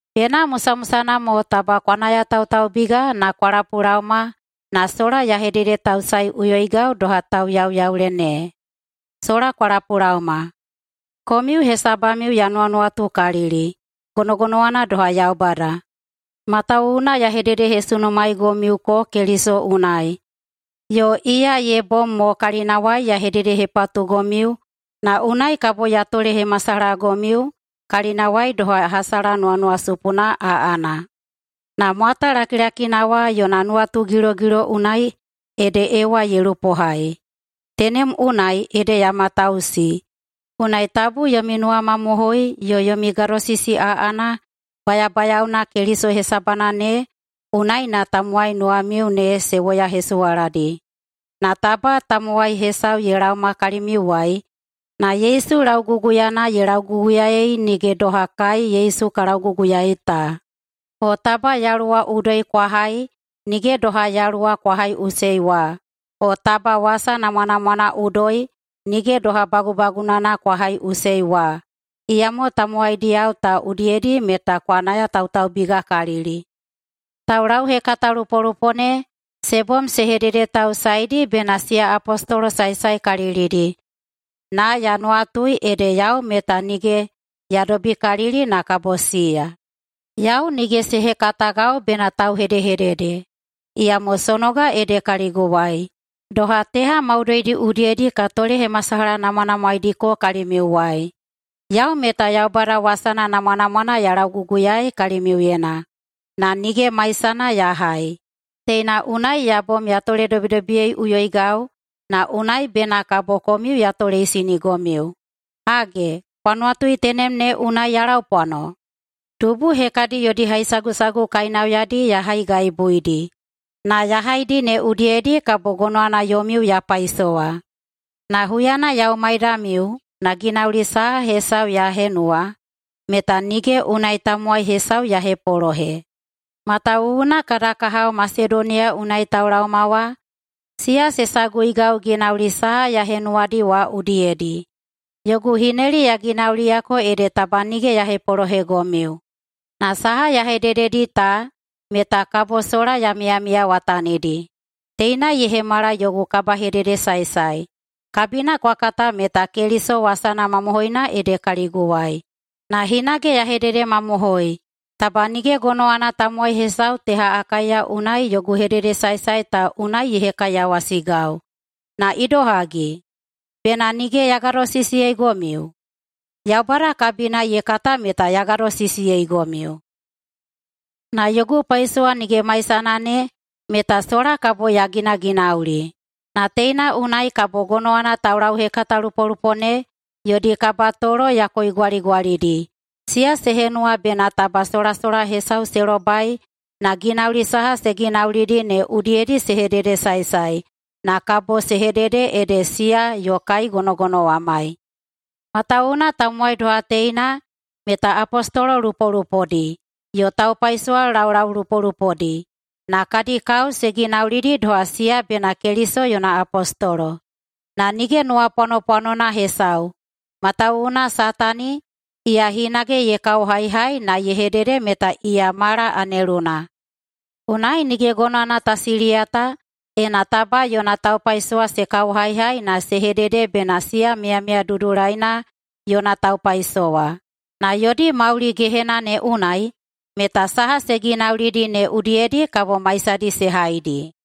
Bena musamusana mo taba kwa nayatautaubiga na kwa lapulaoma na sola ya hededetausaeꞌuyoigau doha tauyauyaule ne. Sola kwa lapulaoma! Komiu hesabamiu ya nuwanuwatukalili, gonogonowana doha Yaubada. Matawuwuna ya hededehesunumaeigomiuko Keliso unai yo iya ye bom mo kalinawai ya hededehepatugomiu na unai kabo ya tolehemasalahagomiu kalinawai doha hasala nuwanuwasupuna aꞌana. Na mwata lakilakina wa yona nuwatugilogilo unai ede Ewa ye lupohai, tenem unai ede ya matausi, unai tabu yomi nuwamamohoi yo yomi gadosisi aꞌana bayabayaona Keliso hesabana ne unai na tamowai nuwamiu ne se woyahesuwaladi. Na taba tamowai hesau ye laowa kalimiuwai na Yesu lauguguyana ye lauguguyaei nige doha kai Yesu ka lauguguyaei ta, o taba yaluwa udoi kwa hai nige doha Yaluwa kwa haiꞌusei wa, o taba wasa namwanamwana udoi nige doha bagubagunana kwa haiꞌusei wa, iyamo tamowaidiyao ta udiyedi meta kwa nayatautaubigakalili. [Taulauhekatalupolupo ne se bom se hededetausaedi bena] siya apostolo saesaekalilidi, na ya nuwatui ede yau meta nige ya dobikalili na kabo siya. Yau nige se hekatagau bena tauhedehedede, iyamo sonoga ede kaliguwai, doha teha maudoidi udiyedi ka tolehemasalahanamwanamwaediko kalimiuwai. Yau meta Yaubada wasana namwanamwana ya lauguguyaei kalimiuyena na nige maisana ya hai. Teina unai ya bom ya toledobidobiyeiꞌuyoigau, na unai bena kabo komiu ya toleisinigomiu. Hage, kwa nuwatui tenem ne unai ya laupwano? Dubu hekadi yodi haisagusagu kainauyadi ya haigaibuidi na ya haidi ne udiyedi kabo gonowana yomiu ya paisowa. Na huyana yau maidamiu na ginauli saha hesau ya henuwa meta nige unai tamowai hesau ya hepolohe, matawuwuna kada kahao Masedoniya unai taulaoma wa, siya se saguigau ginauli saha ya henuwadi wa udiyedi. Yogu hineli ya ginauliyako ede taba nige ya hepolohegomiu na saha ya hedededi ta meta kabo sola ya miyamiyawatanidi. Teina ye hemala yogu kabahededesaesae. Kabina kwa kata meta Keliso wasana mamohoina ede kaliguwai. Na hinage ya hededemamohoi, taba nige gonowana tamowai hesau teha Akaiya unai yogu hededesaesae ta unai ye hekaiyawasigau. Na idohagi? Bena nige ya gadosisiyeigomiu? Yaubada kabina ye kata meta ya gadosisiyeigomiu. Na yogu paisowa nige maisana ne meta sola kabo ya ginaginauli. Na teina unai kabo gonowana taulauhekatalupolupo ne yodi kabatolo ya koigwaligwalidi, siya se henuwa bena taba solasola hesau se lobai na ginauli saha se ginaulidi ne udiyedi se hededesaesae na kabo se hedede ede siya yo kai gonogonowamai. Matawuwuna tamowai doha teina meta apostolo lupolupodi yo taupaisowa laulaulupolupodi, na kadi kao se ginaulidi doha siya bena Keliso yona apostolo. Na nige nuwapwanopwanona hesau, matawuwuna Satani, iya hinage ye kaohaihai na ye hedede meta iya mala aneluna. Unai nige gonowana ta siliyata ena taba yona taupaisowa se kaohaihai na se hedede bena siya miyamiya dudulaina yona taupaisowa. Na yodi mauli gehena ne unai meta saha se ginaulidi ne udiyedi kabo maisadi se haidi.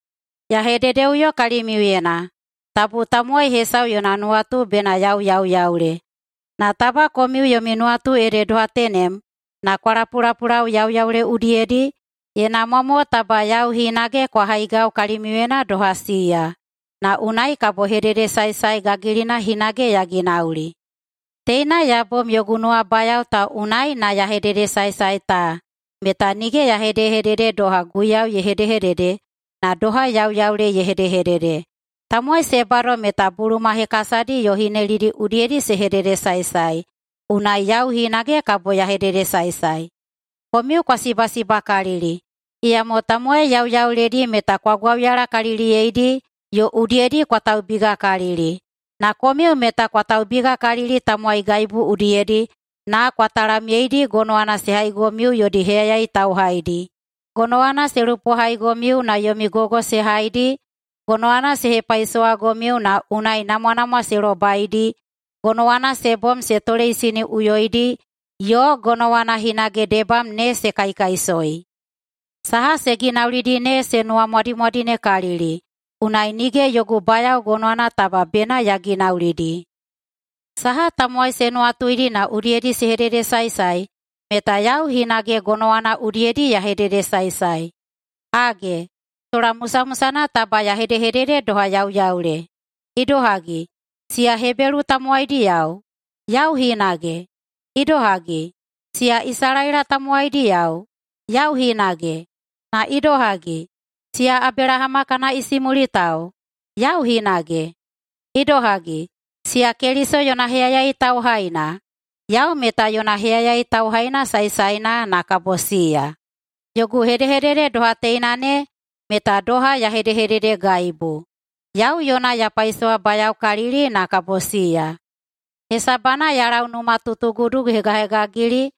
Ya hededeꞌuyo kalimiuyena: Tabu tamowai hesau yona nuwatu bena yau yauyaule. Na taba komiu yomi nuwatu ede doha tenem na kwa lapulapulau yauyaule udiyedi, ye namwa mo taba yau hinage kwa haigau kalimiuyena doha siya, na unai kabo hededesaesae gagilina hinage ya ginauli. Teina ya bom yogu nuwabayao ta unai na ya hededesaesae ta meta nige ya hedehedede doha Guiyau ye hedehedede, na doha yauyaule ye hedehedede. Tamowai se bado meta buluma hekasadi yo hinelidi udiyedi se hededesaesae, unai yau hinage kabo ya hededesaesae. Komiu kwa sibasibakalili, iyamo tamowai yauyauledi meta kwa gwauyalakaliliyeidi yo udiyedi kwa taubigakalili. Na komiu meta kwa taubigakalili tamowaigaibu udiyedi na kwa talamyeidi gonowana se haigomiu yodi heyayai tauhaidi, gonowana se lupohaigomiu na yomi gogo se haidi, gonowana se hepaisowagomiu na unai namwanamwa se lobaidi, gonowana se bom se toleisiniꞌuyoidi, yo gonowana hinage debam ne se kaikaisoi. Saha se ginaulidi ne se nuwamwadimwadinekalili, unai nige yogu bayao gonowana taba bena ya ginaulidi. Saha tamowai se nuwatuidi na udiyedi se hededesaesae, meta yau hinage gonowana udiyedi ya hededesaesae. Hage, sola musamusana taba ya hedehedede doha yauyaule. Idohagi, siya Hebelu tamowaidiyao? Yau hinage! Idohagi, siya Isalaela tamowaidiyao? Yau hinage! Na idohagi, siya Abelahama kana isimulitao? Yau hinage! Idohagi, siya Keliso yona heyayai tauhaina? Yau meta yona heyayai tauhaina saesaena na kabo siya. Yogu hedehedede doha teina ne meta doha ya hedehededegaibu. Yau yona ya paisowabayaokalili na kabo siya, hesabana ya lau numatutugudu hegahegagili,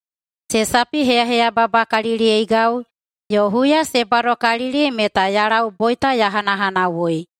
se sapiheyaheyababakaliliyeigau, yo huya se badokalili meta ya lau boita ya hanahanawui.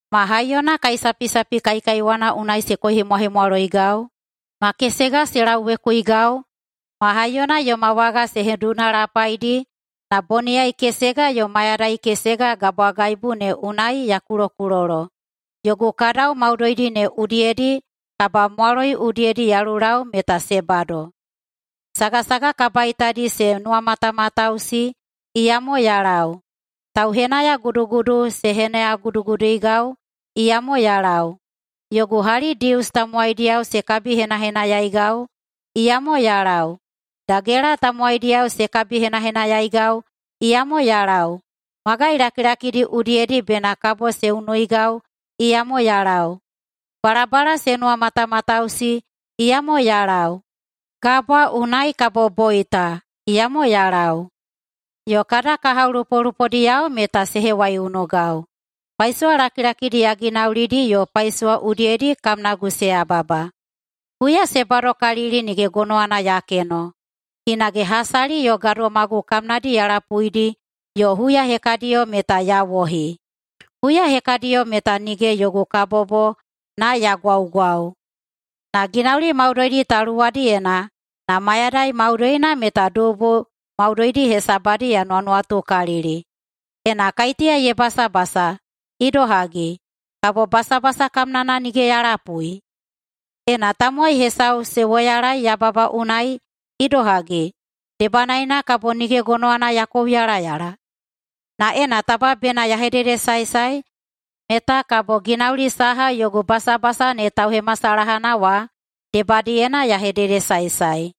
Ma haiyona kaisapisapi kaikaiwana unai se koihemwahemwaloigau, ma kesega se lauwekuigau, ma haiyona yoma waga se hedunalapaidi, na boniyai kesega yo mayadai kesega gabwagaibu ne unai ya kulokulolo. Yogu kadau maudoidi ne udiyedi, kabamwaloi udiyedi ya lulau meta se bado. Sagasaga kabaitadi se nuwamatamatausi, iyamo ya lau. Tauhenahenayagudu se henayaguduigau, iyamo ya lau. Yogu hali Dius tamowaidiyao se kabihenahenayaigau, iyamo ya lau. Dagela tamowaidiyao se kabihenahenayaigau, iyamo ya lau. Magai lakilakidi udiyedi bena kabo se unuigau, iyamo ya lau. Balabala se nuwamatamatausi, iyamo ya lau. Gabwa unai kabo boita, iyamo ya lau. Yo kada kahao lupolupodiyao meta se hewaiunugau. Paisowa lakilakidi ya ginaulidi yo paisowa udiyedi kamnagu se yababa. Huya se badokalili nige gonowana ya keno. Hinage hasali yo gadomagu kamnadi ya lapuidi yo huya hekadiyo meta ya wohi. Huya hekadiyo meta nige yogu kabobo na ya gwaugwau. Na ginauli maudoidi ta luwadiyena na mayadai maudoina meta dubu maudoidi hesabadi ya nuwanuwatukalili. Ena kaiteya ye basabasa, idohagi, kabo basabasa kamnana nige ya lapui? Ena tamowai hesau se woyalaei yababa unai, idohagi, debanaena kabo nige gonowana ya kouyalayala? Na ena taba bena ya hededesaesae, meta kabo ginauli saha yogu basabasa ne tauhemasalahana wa debadiyena ya hededesaesae.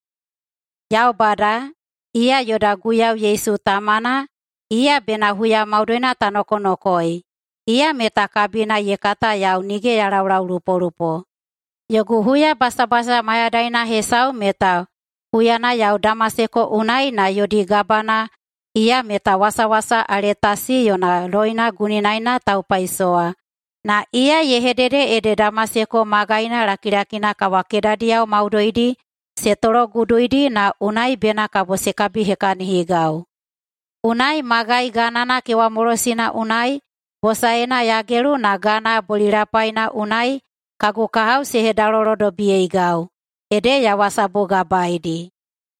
Yaubada, iya yoda Guiyau Yesu Tamana, iya bena huya maudoina ta nokonokoei, iya meta kabina ye kata yau nige ya laulaulupolupo. [Yogu huyabasabasa mayadaina hesau meta] huyana yau Damaseko unai na yodi gabana, iya meta wasawasa Aletasi yona loina guninaena taupaisowa, na iya ye hedede ede Damaseko magaina lakilakina kawakedadiyao maudoidi se tologuduidi na unai bena kabo se kabihekahinigau. Unai magai ganana kewamolosina unai bosaena ya gelu na gana bolilapaina unai kagu kahao se hedalolodobiyeigau, ede ya wasabugabaeidi.